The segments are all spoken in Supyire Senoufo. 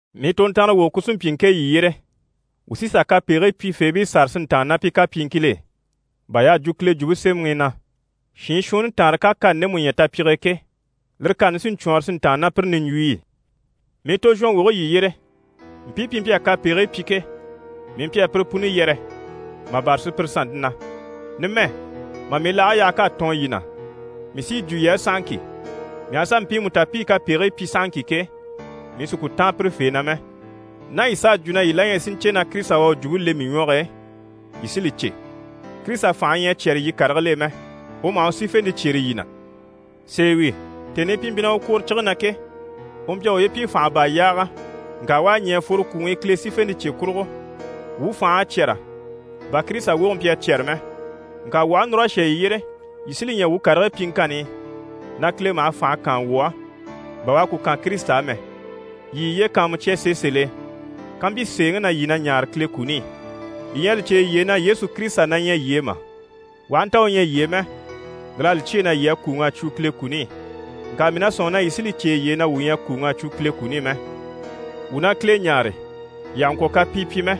Mii tontanrawoge ku sí n‑pyi ŋke yii yyére. Wuu sí n-sà kapegigii pyifeebii sâra si ntàanna ná pi kapyiŋkil'e, bà y'à jwo Kile Jwumpe Semɛŋi i na: «Shiin shuunni taanre ká kani ndemu ɲya tapyige e ke, lire kani sí n‑cwɔɔnrɔ si ntàanna ná pire niɲjwuyi i.» Mii tozhɔnwoge yii yyére, mpii pi mpyi a kapegigii pyi ke, mii mpyi a pire puni yɛrɛ, mà bâra sùpyire sannte na. Numɛ, mà mii laage yaha k'à tɔɔn yii na, mii sí yi jwo yii á sahaŋki, mii aha sà mpiimu ta pi i kapegigii pyi sahaŋki ke, mii sì ku táan pirefee na mɛ. Ná yii s'à jwo na yii la ɲyɛ si ɲcè na Kirisita u à u jwumpe le mii ɲwɔge e, yii sí li cè. Kirisita fànhe ɲyɛ a cyɛ́rɛ yii karigil'e mɛ, u maha u sífente cyêre yii na. Sèe wi, tèni i pi mpyi na u kwòre cige na ke, u mpyi a uye pyi fànha baa yaaga, ŋka u à ɲɛ̀ a fworo kwùŋi i Kile sífente cye kurugo. Wuu fành'à cyɛ́rɛ, bà Kirisita woge mpyi a cyɛ́rɛ mɛ. Ŋka wuu aha núr'a shà yii yyére, yii sí li ɲya wuu karigii pyiŋkanni i, na Kile maha fànhe kaan wuu á, bà u à ku kan Kirisita á mɛ. Yii yiye kàanmucya sèe sèl'e kampyi sèeŋi na yii na ɲaare Kile kuni i. Yii ɲyɛ a li cè yiye e na Yesu Kirisita na ɲyɛ yii e mà? U aha nta u ɲyɛ yii e mɛ, lir'à li cyêe na yii à kùuŋ'a cwo Kile kuni i. Ŋka mii na sɔ̂nŋi yii sí li cè yiye e na wuu ɲyɛ a kùuŋ'a cwo Kile kuni i mɛ. Wuu na Kile ɲáare, yii àha ŋkwɔ̀ kapii pyi mɛ.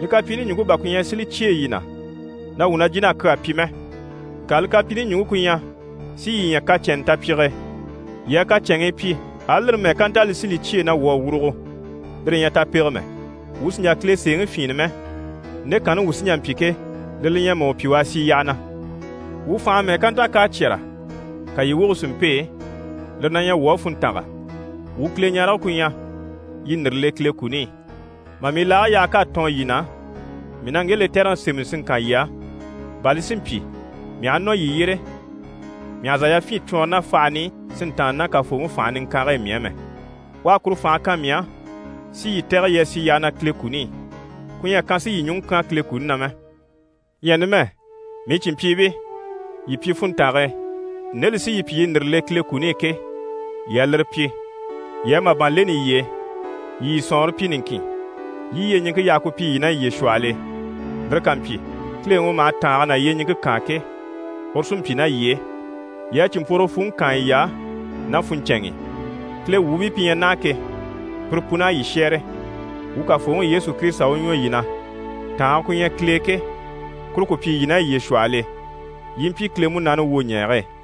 Li kapyiini ɲùŋke bà ku ɲyɛ si li cyêe yii na na wuu na jìn'a kyaa pyi mɛ, ŋka li kapyiini ɲùŋke ku ɲyɛ si yii ɲya kacɛnnɛ tapyige e. Yii a kacɛnŋii pyi, ali lire mɛ́ɛ ká nta li sí li cyêe na wuu à wurugo, lire ɲyɛ tapege mɛ. Wuu sì n‑jà Kile sèeŋi fyìinnɛ mɛ, nde kanni wuu sí n‑jà n‑pyi ke, lire li ɲyɛ mà u pyi u a sì yyaha na. Wuu fànhe mɛ́ɛ ká nta k'à cyɛ́rɛ, ka yii woge si mpêe, lire na ɲyɛ wuu á funntanga. Wuu Kileɲarege ku ɲyɛ, yii ndìre le Kile kuni i. Mà mii laage yaha k'à tɔɔn yii na, mii na ŋge lɛtɛrɛŋi sémɛni si ŋkan yii á, bà li si mpyi, mii aha nɔ yii yyére, mii àha zà yafyin cwɔɔnrɔ ná fahan'i si ntàanna ná Kafooŋi fànhe niŋkange e mii á mɛ. U à kuru fànhe kan mii á, si yii tɛ̀gɛ yii a sì yyaha na Kile kuni i. Ku ɲyɛ a kan si yii ɲùŋɔ kyán Kile kuni na mɛ. Ɲyɛ numɛ, mii cìnmpyiibii, yii pyi funntange e. Nde li sí yii pyi yii ndìre le Kile kuni i ke, yii a lire pyi. Yii a màban leni yiye e. Yii yii sɔ̀nŋɔre pyi niŋkin, yii i yyeɲiŋke yaha ku pyi yii ná yiye shwɔhɔl'e. Lire ká mpyi, Kileŋi u maha tàange ná yyeɲiŋke kaan ke, uru sí n‑pyi ná yii e. Yii a cìnmpworogo fwùŋi kaan yiy'á ná funɲcɛnŋi i. Kile wuubii pi ɲyɛ naha ke, pire pun'à yii shɛ́ɛre. Wuu Kafooŋi Yesu Kirisita u ɲwɔ yii na, tàange ku ɲyɛ Kile e ke, kuru ku pyi yii ná yiye shwɔhɔl'e, yii i mpyi Kile Munaani wwoɲɛɛge e.